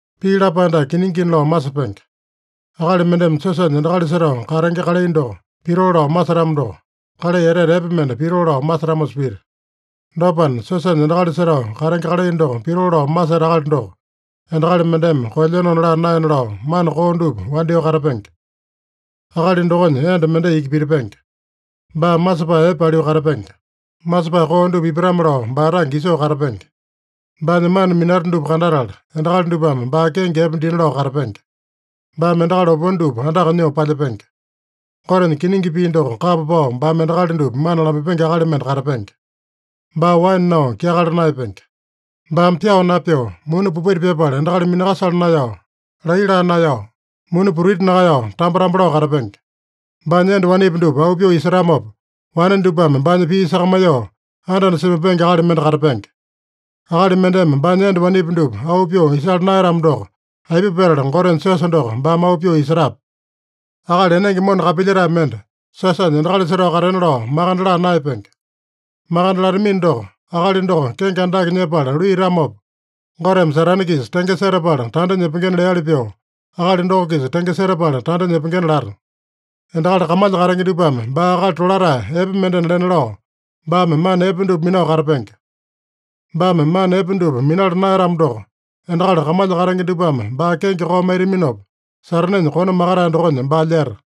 Pii lapae dake kiningina lao masepenge: Akali mendeme siosanya endakali setao katenge kalai doko pitoo lao masetamo doko, kalai etete epe mende pitoo lao masetamosa pita. Dopana, siosanya endakali setao katenge kalai doko pitoo lao maseta akali doko, endakali mendeme koelyenona laa naena lao mana koo dupa wandyoo katapenge. Akali dokonya enda mendai iki pitipenge. Baa masepae epe paliu katapenge. Masepae koo dupa ipatame-lao baa tange isoo katapenge. Baanya mana minata dupa kandatala, endakali dupame baa kenge epe dina lao katapenge. Baame endakali opone dupa andaka nyoo palyepenge. Gotenya kiningi pii doko kapa pao baame endakali dupa mana lamaipenge akali mende katapenge. Baa waene nao kyakala naeyapenge. Baame pyao napyoo, muni popaita pyapala endakali minakasala naeyao, laiya laa naeyao, muni putiti nakaeyao, tambo-tambo lao katapenge. Baanya enda wanepi dupa auu pyoo isetamopa, wane dupame baanya pii sakamaiyoo anda-anda semaipenge akali mende katapenge. (Akali mendeme baanya enda wanepi dupa auu pyoo isala naeyatamo doko, aipa petala Gotenya siosa doko baame auu pyoo isetape?) Akali enenge mona kapilyetae mende siosanya endakali setao katena lao makande laa naeyapenge. Makande latamino doko, akali doko kenge andake nyepala luiyatamopa, Goteme Satane-kisa tenge setapala tanda nyepengena leali pyoo, akali doko-kisa tenge setapala tanda nyepengena lata. Endakali kamalya katenge dupame baa akali tolatae epe mendena lena lao, baame mana epe dupa minao katapenge. Baame mana epe dupa minala naeyatamo doko, endakali kamalya katenge dupame baa kenge koo maitaminopa, Satanenya kone makatae dokonya baa lyeta.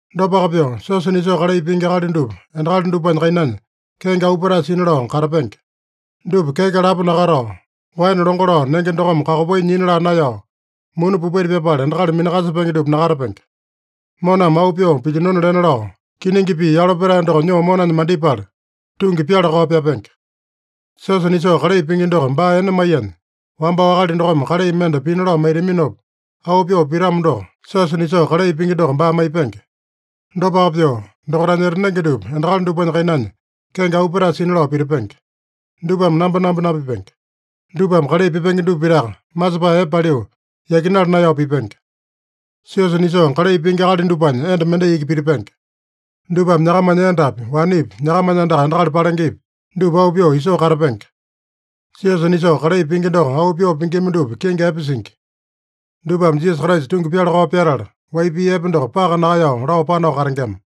Dopaka pyoo, siosa nisoo kalai pingi akali dupa endakali dupanya kainanya kenge auu petae sina lao katapenge. Dupa keke lapo nakatao, waene longo lao nenge dokome kakopai nyina laa naeyao, muni popaita pyapala endakali minakasepenge dupa nakatapenge. Moname auu pyoo pilyinona lena lao, kiningi pii yalo petae doko nyoo monanya mandipala, tungi pyala-kao pyapenge. Siosa nisoo kalai pingi doko baa ene maiyanya, wambao akali dokome kalai mende pina lao maitaminopa, auu pyoo pitamo doko, siosa nisoo kalai pingi doko baa maipenge. Dopaka pyoo, dokaitanya etanenge dupa endakali dupanya kainanya kenge auu petae sina lao pitipenge. Dupame nambonambo napipenge. Dupame kalai pipenge dupa pitaka, masepae epe paliu, yakinala naeyao pipenge. Siosa nisoo kalai pingi akali dupanya enda mendai iki pitipenge. Dupame nyakamanya endapi, wanepi, nyakamanya andaka endakali palengepi, dupa auu pyoo isoo katapenge. Siosa nisoo kalai pingi doko auu pyoo pingima dupa kenge epe singi. Dupame Jisasa Kraisa tungi pyala-kao pyatala, wai pii epe doko paka nakaeyao lao panao katengema.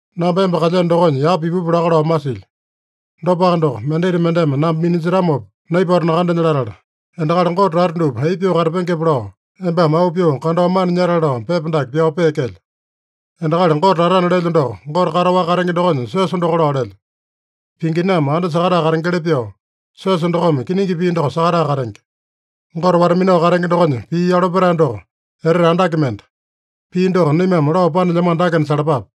Namba emba kalyeno dokonya yapa ipupu laka lao masilyo. Dopaka doko, mendita mendeme namba minanjetamopa naipato nakandenya latala, endakali Gote tata dupa aipa pyoo katapengepe lao, embame auu pyoo kandao mana nyatale lao pepa dake pyao peekelyo. Endakali Gote tatana lelyo doko, Gote kataowaka katenge dokonya siosa doko lao lelyo. Pinginame anda sakatae katengeli pyoo, siosa dokome kiningi pii doko sakatae katenge. Gote wata-minao katenge dokonya pii yalo petae doko etete andake mende. Pii doko naimame lao panelyamano dakena salapape: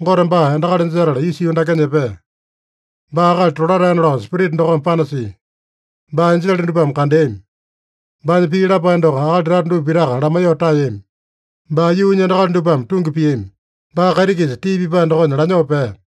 Gote baa endakali jetala isa yuu dakenya epea. Baa akali tolataena lao Spirita dokome panasia. Baa enjele dupame kandeami. Baanya pii lapae doko akali tata dupa pitaka lamaiyoo taeyami. Baa yuunya endakali dupame tungi piami. Baa kaiti-kisa tii pipae dokonya lanyoo pea.